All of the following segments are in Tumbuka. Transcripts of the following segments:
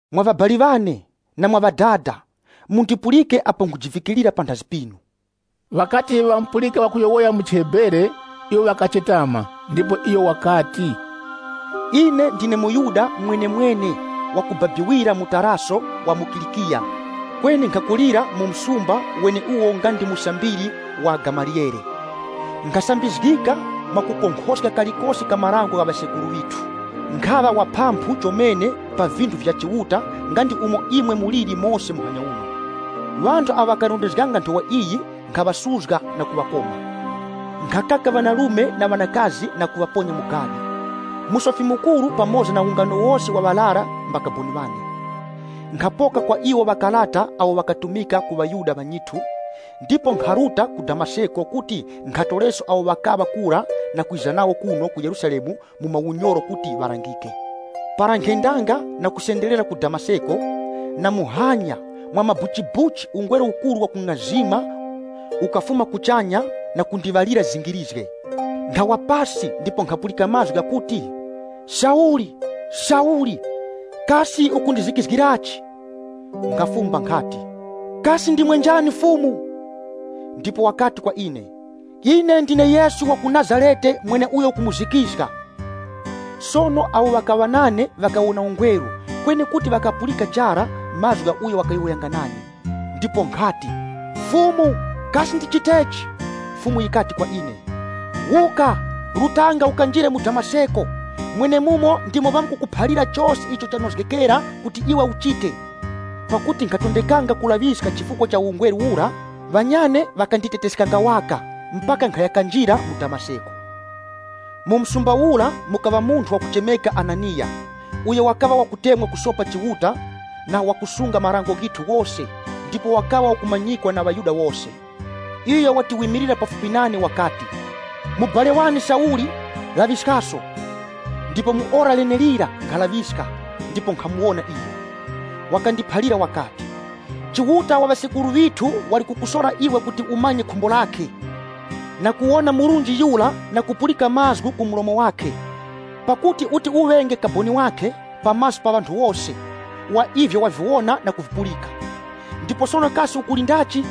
“Mwa ŵabali ŵane, na mwa ŵadada, mundipulike apo nkhujivikirira panthazi pinu.” Ŵakati ŵamupulika wakuŵayowoyera mu chiHebere, iwo ŵakachetama. Ndipo iyo wakati, “Ine ndine muYuda mwenemwene wa kubabikira mu Taraso wa mu Kilikiya kweni nkhakulira mu msumba weneuwo nga ndi musambiri wa Gamaliyele. Nkhasambizgika mwakukonkhoska kalikose ka marango gha ŵasekuru ŵithu. Nkhaŵa wa phamphu chomene pa vinthu vya Chiuta nga ndi umo imwe muliri mose muhanya uno. Ŵanthu awo ŵakarondezganga Nthowa iyi nkhaŵasuzga na kuŵakoma. Nkhakaka ŵanarume na ŵanakazi na kuŵaponya mu gadi. Musofi Mukuru pamoza na ungano wose wa ŵarara mbakaboni ŵane. Nkhapoka kwa iwo makarata agho ghakatumika ku ŵaYuda ŵanyithu, ndipo nkharuta ku Damaseko kuti nkhatoreso awo ŵakaŵa kura na kwiza nawo kuno ku Yerusalemu mu maunyoro kuti ŵalangike. “Para nkhendanga na kusenderera ku Damaseko, na muhanya, mwamabuchibuchi ungweru ukuru wakung'azima ukafuma kuchanya na kundiŵalira zingirizge. Nkhawa pasi ndipo nkhapulika mazgu ghakuti, ‘Sauli, Sauli! Kasi ukundizikizgirachi?’ Nkhafumba nkhati, ‘Kasi ndimwe njani Fumu?’ Ndipo wakati kwa ine, ‘Ine ndine Yesu wa ku Nazarete mweneuyo ukumuzikizga.’ Sono awo ŵakaŵa nane ŵakawona ungweru kweni kuti ŵakaghapulika chara mazgu gha uyo wakayowoyanga nane. Ndipo nkhati, ‘Fumu, kasi ndichitechi?’ Fumu yikati kwa ine, ‘Wuka, rutanga ukanjire mu Damaseko, mwenemura ndimo ŵamkukuphalira chose icho chanozgekera kuti iwe uchite.’ Pakuti nkhatondekanga kulaŵiska chifukwa cha ungweru ura, ŵanyane ŵakanditeteskanga waka, mpaka nkhaya kanjira mu Damaseko. “Mu msumba ura mukakharanga munthu zina lakhe Hananiya, uyo wakaŵa wakutemwa kusopa Chiuta na wakusunga marango ghithu ghose ndipo wakaŵa wakumanyikwa na ŵaYuda wose. Iyo wati wimilira pafupi nane wakati, ‘Mubali wane Sauli, laŵiskaso.’ Ndipo mu ora lenelira nkhalaŵiska ndipo nkhamuwona iyo. Wakandiphalira wakati, ‘Chiuta wa ŵasekuru ŵithu wali kukusora iwe kuti umanye khumbo lakhe, na kuwona Murunji Yura na kupulika mazgu ku mlomo wakhe. Pakuti uti uŵenge kaboni wakhe, pa maso pa ŵanthu wose, wa ivyo waviwona na kuvipulika. Ndipo sono kasi ukulindachi?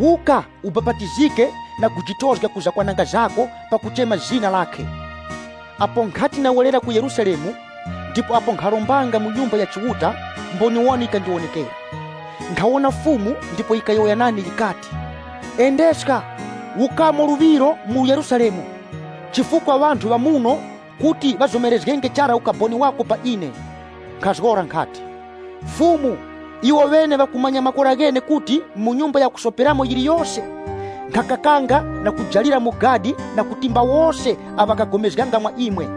Wuka, ubapatizike na kujitozga ku zakwananga zako pakuchema zina lakhe.’ “Apo nkhati ndawerera ku Yerusalemu, ndipo apo nkharombanga mu Nyumba ya Chiuta, mboniwoni yikandiwonekera. Nkhawona Fumu ndipo yikayowoya nane yikati, ‘Endeska wukamo luŵiro mu Yerusalemu, chifukwa ŵanthu ŵa muno kuti ŵazomerenge chara ukaboni wako pa ine.’ Nkhazgora nkhati, ‘Fumu, iwoŵene ŵakumanya makora ghene kuti mu nyumba ya kusoperamo yiliyose, nkhakakanga na kujalira mu gadi na kutimba wose awo ŵakapulikananga mwa imwe.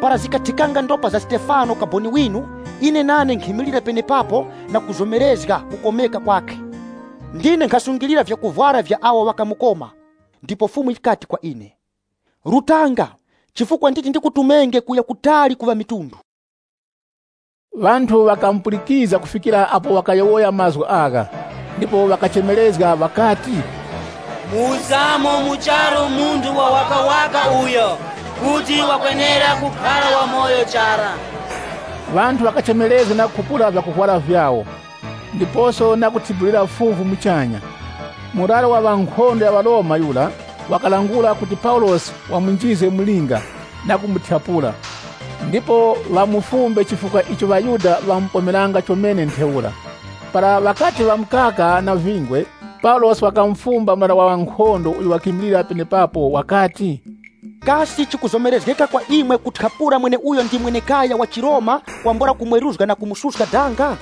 Para zikathikanga ndopa za Stefano kaboni winu, ine nane nkhimilira penepapo na kuzomerezga kukomeka kwakhe. Ndine nkhasungilira vyakuvwara vya awo ŵakamukoma.’ Ndipo Fumu yikati kwa ine, ‘Rutanga, chifukwa nditi ndikutumenge kuya kutali ku ŵamitundu.’” Ŵanthu ŵakamupulikizga kufikira apo wakayowoya mazgu agha, ndipo ŵakachemerezga ŵakati, “Muwuskamo mu charu munthu wawakawaka uyo! Kuti wakwenera kukhara wamoyo chara!” Ŵanthu ŵakachemerezga na kukhupula vyakuvwara vyawo, ndiposo na kuthibulira fuvu muchanya. Murara wa ŵankhondo ya ŵaRoma yura wakaŵalangula kuti Paulosi ŵamunjizge mu linga, na kumuthyapula, ndipo ŵamufumbe chifukwa icho ŵaYuda ŵamupomeranga chomene ntheura. Para ŵakati ŵamukaka na vingwe, Paulosi wakamufumba murara wa ŵankhondo uyo wakimilira penepapo wakati, “Kasi chikuzomerezgeka kwa imwe kuthyapula mweneuyo ndi mwenekaya wa chiRoma kwambula kumweruzga na kumususka danga?”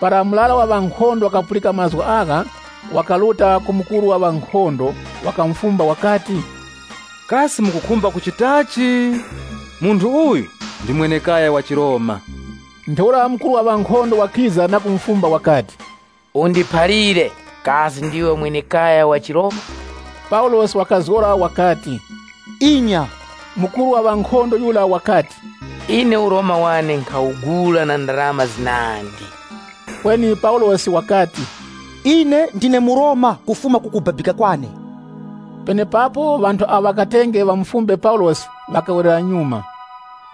Para murara wa ŵankhondo wakapulika mazgu agha, wakaruta ku mukuru wa ŵankhondo, wakamufumba wakati, “Kasi mukukhumba kuchitachi? Munthu uyu ndi mwenekaya wa chiRoma.” Ntheura mukuru wa ŵankhondo wakiza na kumufumba wakati, “Undiphalire, kasi ndiwe mwenekaya wa chiRoma?” Paulosi wakazgora wakati, “Inya.” Mukuru wa ŵankhondo yura wakati, “Ine uRoma wane nkhawugula na ndarama zinandi.” Kweni Paulosi wakati, “Ine ndine muRoma kufuma kukubabika kwane.” Penepapo ŵanthu awo ŵakatenge ŵamufumbe Paulosi ŵakawerera nyuma.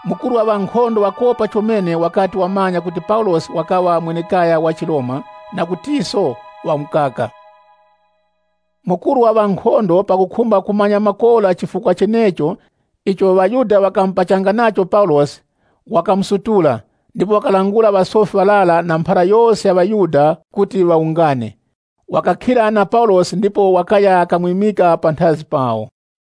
Mukuru wa ŵankhondo wakopa chomene wakati ŵamanya kuti Paulosi wakaŵa mwenekaya wa chiRoma na kutiso wamukaka. Mukuru wa ŵankhondo pakukhumba kumanya makora chifukwa chenecho icho ŵaYuda ŵakamupachanga nacho Paulosi, wakamusutula, ndipo wakalangula ŵasofi ŵarara na mphara yose ya ŵaYuda kuti ŵawungane. Wakakhira na Paulosi ndipo wakaya kamwimika panthazi pawo.